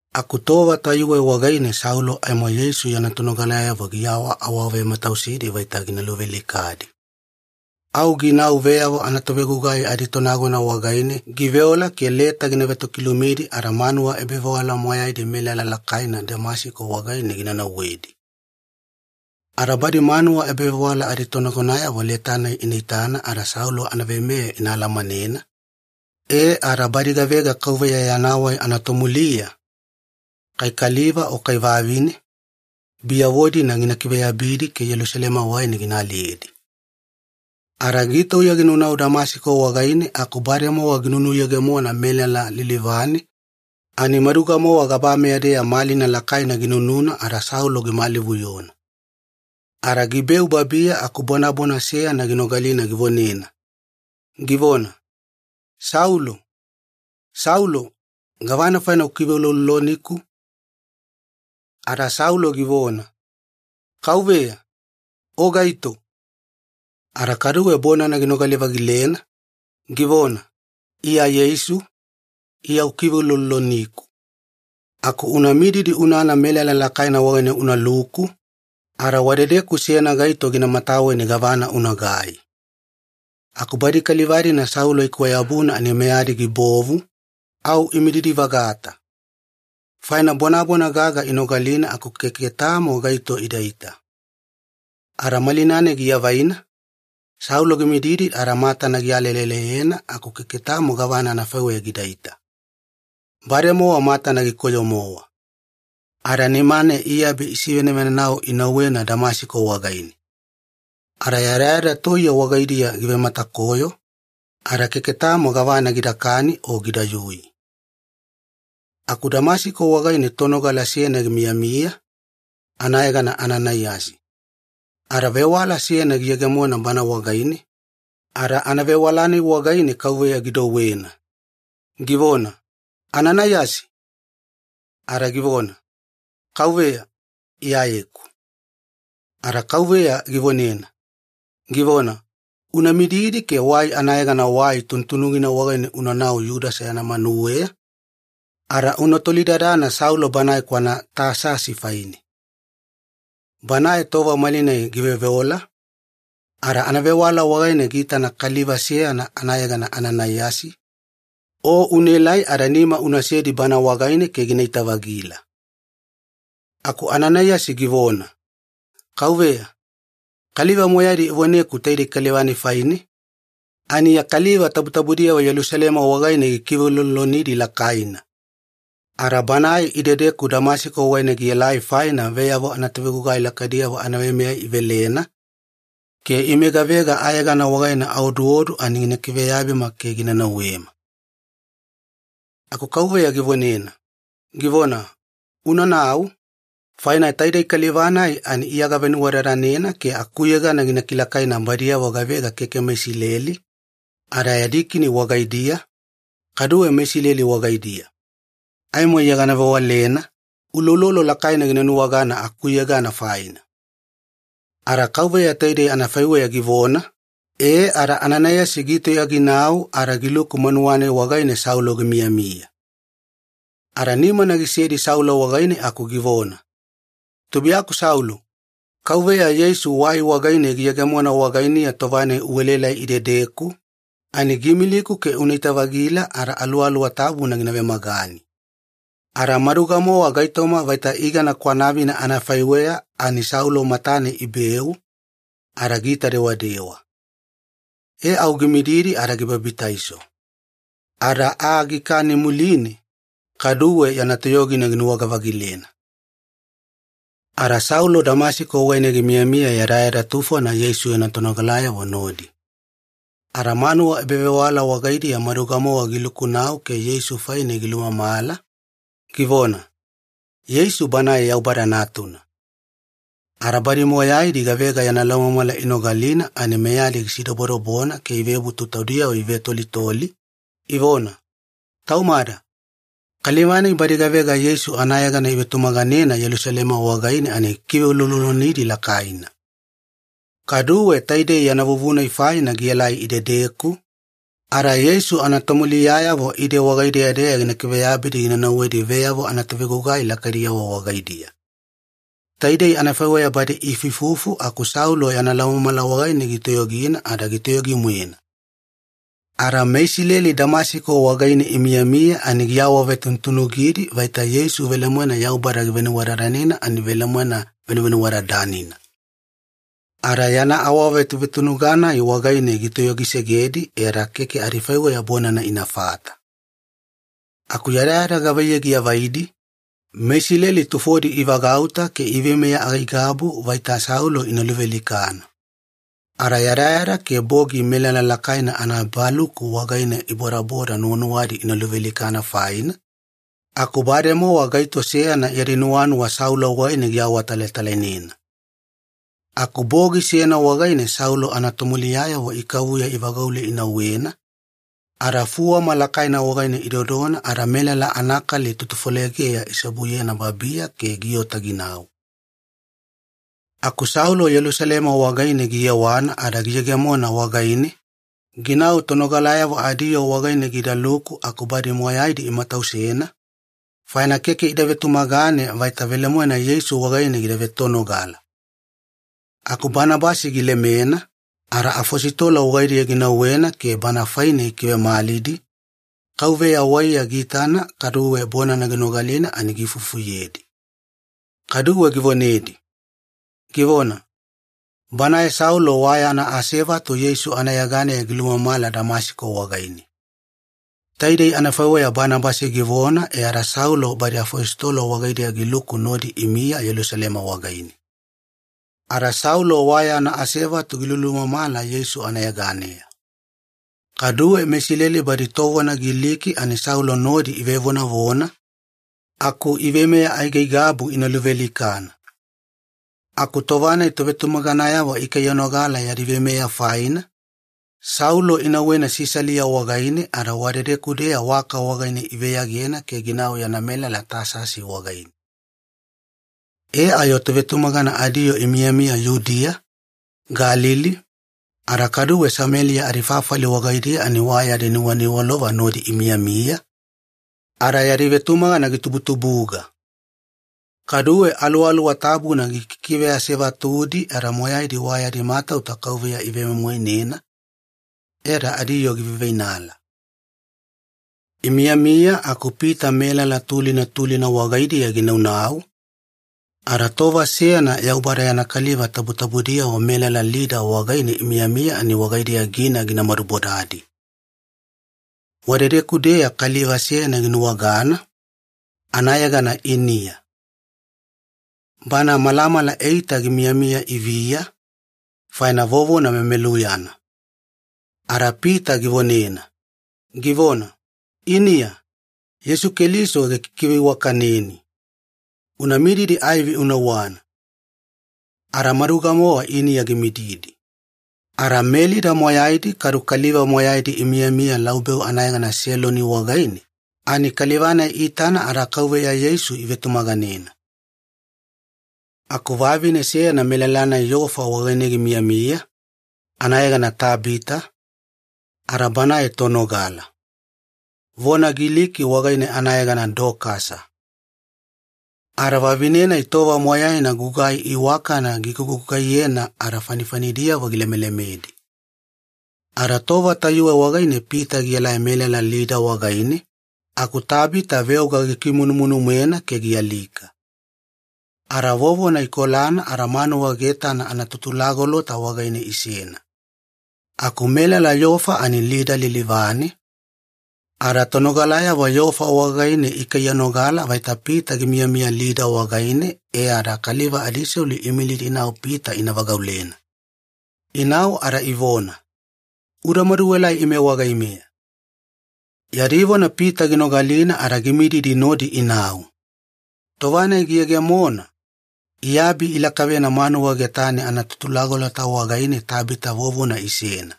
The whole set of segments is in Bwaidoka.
Aku tova tayuwe wagaine Saulo aimo Yeisu yana tonogalayavo giawaawavematausidi vaita gina luvealikadi. Au ginau veyavo anatovegugai aditonagona wagaine giveola ke leta gina vetokilumidi ada manuwa ebavewala moyaidi melala lakaina Damasiko wagaine gina nauwedi. Ada badi manuwa ebavewala aditonagonayavo leta-nai ina itana ada Saulo anaveimeya ina alamanena, e ada badi gavega Kauveya Yana Wai anatomuliya, kai kaliva o kai vavine, biyavo-dina gina kiveyabidi ke Yelusalema wagaine gina aliyedi. E, ada gitauya ginaunau Damasiko wagaine aku bademowa ginunuyegemona melala lilivane ani maduga-mowa gabameya-deya malina lakaina ginununa ada Saulo gimalivuyona. Ada gibeu babiya aku bonabona seyana ginogalina givonena, givona, “Saulo, Saulo! Gavana faina ukiveulouloloniku?” Ada Saulo givona, “Kauveya, o gaito?” Ada kaduwe bonana ginogali-vagilena, givona, “Iya Yeisu, Iya ukiveulouloloniku. Aku una mididi unana melala lakaina wagaine unaluku, ada wadedeku seyana gaito gina mataweni gavana unagai.” Aku badi kaliva-dina Saulo ikwayabuna ani meyadi gibovu, au imididi-vagata. Faina bonabona gaga inogalina aku keke tamo gaito idaita. Ada malina-nai giavaina, Saulo gimididi ada matana gialeleleyena aku keke tamo gavana anafaiweya gidaita. Bademowa matana gikoyo-mowa. Ada nimane iabi isivenavenau inauwena Damasiko wagaine. Ada yadayada toiye wagaidiya givematakoyo, ada keke tamo gavana gidakani o gidayui. Aku Damasiko wagaine tonogala seyana gimiyamiya, anayegana Ananaiyasi. Ada vewala seyana giyegemona bana wagaine, ada anavewala-nai wagaine Kauveya gidouwena, givona, “Ananaiyasi!” Ada givona, “Kauveya, Iyayeku.” Ada Kauveya givonena, givona, “Una mididi ke wai anayegana Wai Tunutunugina wagaine unanau Yudasa yana manuweya, ada una tolidadana Saulo banae kwana Tasasi faine. Banae tova malinai giveoveola, ada anavewala wagaine giitana kaliva seyana anayegana Ananaiyasi, o unaelai ada nima unasedi bana wagaine ke ginaita-vagila.” Aku Ananaiyasi givona, “Kauveya, kaliva moyaidi ivoneku taidei kaliva-nai faine, ani ya kaliva tabutabudiyavo Yelusalema wagaine gikiveuloulolonidi lakaina! Ada banae idedeku Damasiko wagaine gielai faina veyavo anatovegugai lakaidiyavo anaveimeya ivelena, ke ime gavega ayegana wagaine aoduodu ani gina kiveyabima ke gina nauwema.” Aku Kauveya givonena, givona, “Unanau, faina taidei kaliva-nai ani Iya gavenuwadadanena ke akuyegana gina kilakaina badiyavo gavega keke meIsileli, ada yadi kini wagaidiya, kaduwe meIsileli wagaidiya. Aimo Iya gana vewalena, uloulolo lakaina gina nuwagana akuyegana faina.” Ada Kauveya taidei anafaiweya givona, e ada Ananaiyasi gitauya ginau ada giluku manuwa-nai wagaine Saulo gimiyamiya. Ada nimana gisedi Saulo wagaine aku givona, “Tubuiyaku Saulo, Kauveya Yeisu wai wagaine giyegemona wagainiya tova-nai uelaelai idedeku, ani giimiliku ke unaita-vagila ada Aluwaluwa Tabuna gina vemagani.” Ada maduga-mowa gaitoma vaita igana kwanavina anafaiweya ani Saulo matane ibeu, ada giita dewadewa. E au gimididi ada gibabitaiso. Ada aa gikani muline, kaduwe yana toyogina ginuwaga-vagilena. Ada Saulo Damasiko wagaine gimiyamiya yadayada tufona Yeisu yana tonogalayavo nodi. Ada manuwa ebavewala wagaidiya maduga-mowa gilukunau ke Yeisu faine gilumamala, givona, “Yeisu Banae Yaubada Natuna.” Ada badi moyaidi gavega yana laumamala inogalina ani meyadi gisidobodobona ke ivebutu taudiyavo ivetolitoli, ivona, “Taumada! Kaliva-nai badi gavega Yeisu anayegana ivetumaganena Yelusalema wagaine ani gikiveuloulolonidi lakaina. Kaduwe taidei yana vuvuna-nai faina gielai idedeku, ada Yeisu anatomuliyayavo ide wagaideya-deya gina kiveyabidi gina nauwedi veyavo anatovegugai lakaidiyavo wagaidiya.” Taidei anafaiweya badi iifuifufu aku Saulo yana laumamala wagaine gitoyogina ada gitoyogi-moena. Ada meIsileli Damasiko wagaine imiyamiya ani giawavetunutunugidi vaita Yeisu velemoena Yaubada givenuwadadanena ani velemoena Venuvenuwadadanina. Ada yana awavetuvetunuga-nai wagaine gitoyogisegedi e ada keke adifaiweya bonana inafata. Aku yadayada gavaiyei giavaidi, meIsileli tufodi ivagauta ke iveimeya aigaigabu vaita Saulo ina luvealikana. Ada yadayada ke bogi melala lakaina anaebaluku wagaine ibodabodana nuwanuwadi ina luvealikana faina, aku bademowa gaito seyana yadi nuwanuwa Saulo wagaine giawatalatalainena. Aku bogi seyana wagaine Saulo anatomuliyayavo ikavuya ivagaule inauwena, ada fuwama lakaina wagaine idodona ada melala anakali tutufolegeya iseobuyena babiya ke giota ginau. Aku Saulo Yelusalema wagaine giyewana ada giyegemona wagaine, ginau tonogalayavo adiyoo wagaine gidaluku aku badi moyaidi imatausena, faina keke ida vetumagane vaita velemoena Yeisu wagaine gida vetonogala. Aku Banabasi gilemena, ada afositolo wagaidiya ginauwena ke bana faine gikivemalidi, Kauveya waiya giitana kaduwe bonana ginogalina ani giifufuyedi. Kaduwe givonedi, givona, “Banae Saulo wa yana asevatu Yeisu anayeganeya gilumamala Damasiko wagaine.” Taidei anafaiweya Banabasi givona e ada Saulo badi afositolo wagaidiya giluku nodi imiya Yelusalema wagaine. Ada Saulo wa yana asevatu gilulumamala Yeisu anayeganeya. Kaduwe meIsileli badi tovona Giliki ani Saulo nodi ivevonavona, aku iveimeya aigaigabu ina luvealikana. Aku tova-nai tovetumaganayavo ikaiyanogala yadi veimeya faina, Saulo inauwena Sisalia wagaine ada wadedeku-deya waka wagaine iveyagena ke ginau yana melala Tasasi wagaine. E ayo tovetumagana adiyoo imiyamiya Yudiya, Galili, ada kaduwe Sameliya adifafali wagaidiya ani wa yadi nuwaniwalova nodi imiyamiya, ada yadi vetumagana gitubutubuga. Kaduwe Aluwaluwa Tabuna gikikiveasevatudi ada moyaidi wa yadi matauta Kauveya ivemoimoinena, e ada adiyoo giveiveinala. Imiyamiya aku Pita melala tulina tulina wagaidiya ginaunau, ada tova seyana Yaubada yana kaliva tabutabudiyavo melala Lida wagaine imiyamiya ani wagaidiya gina gimadubodadi. Wadedeku-deya kaliva seyana ginuwagana, anayegana Iniya. Bana malamala eita gimiyamiya iviya, faina vovona memeluyana. Ada Pita givonena, givona, “Iniya, Yeisu Keliso gikikiveiwakaneni. Una mididi aivi una uwana.” Ada maduga-mowa Iniya gimididi. Ada meLida moyaidi kadu kaliva moyaidi imiyamiya laubeu anayegana Seloni wagaine, ani kaliva-nai iitana ada Kauveya Yeisu ivetumaganena. Aku vavine seyana melala-nai Yofa wagaine gimiyamiya, anayegana Tabita, ada banae tonogala. Vona Giliki wagaine anayegana Dokasa. Ada vavine-nai tova moyaina gugai iwakana gigugugaiyena ada fanifanidiyavo gilemelemedi. Ada tova tayuwe wagaine Pita gielai melala Lida wagaine, aku Tabita veoga gikimunumunu-moena ke gialika. Ada vovona ikolana ada manuwa getana anatutulagolota wagaine isena. Aku melala Yofa ani Lida lilivane, ada tonogalayavo Yofa wagaine ikaiyanogala vaita Pita gimiyamiya Lida wagaine e ada kaliva adiselu iimilidi inau Pita ina vagaulena. Inau ada ivona, “Uda maduelai ime wagaimeya.” Yadi vona Pita ginogalina ada gimididi nodi inau. Tova-nai giyegemona, iabi ilakavena manuwa getane anatutulagolota wagaine Tabita vovona isena.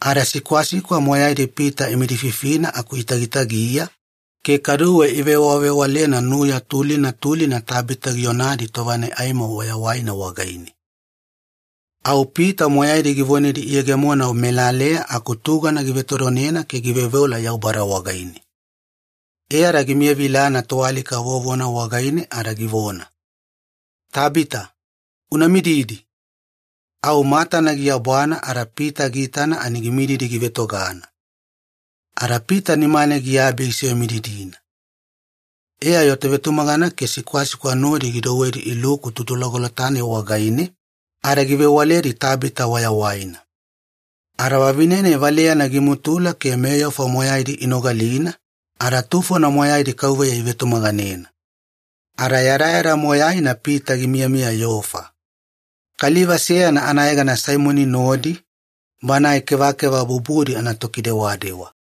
Ada sikwasikwa moyaidi Pita imidififina aku itagitagiya, ke kaduwe ivewavewalena nuya tulina tulina Tabita gionadi tova-nai aimo wayawaina wagaine. Au Pita moyaidi givonedi iyegemona melaleya aku tugana givetodonena ke giveoveola Yaubada wagaine. E ada gimiyavilana toalika vovona wagaine ada givona, “Tabita, una mididi!” Au matana giabwana ada Pita giitana ani gimididi givetogana. Ada Pita nimane giabi gisivemididina. E ayo tovetumagana ke sikwasikwa nodi gidouwedi iluku tutulagolota-nai wagaine, ada givewaledi Tabita wayawaina. Ada vavine-nai valeyana gimutula ke meYofa moyaidi inogalina, ada tufona moyaidi Kauveya ivetumaganena. Ada yadayada moyaina Pita gimiyamiya Yofa. Kaliva seyana anayegana Saimoni nodi, banae kevakeva bubudi anatokidewadewa.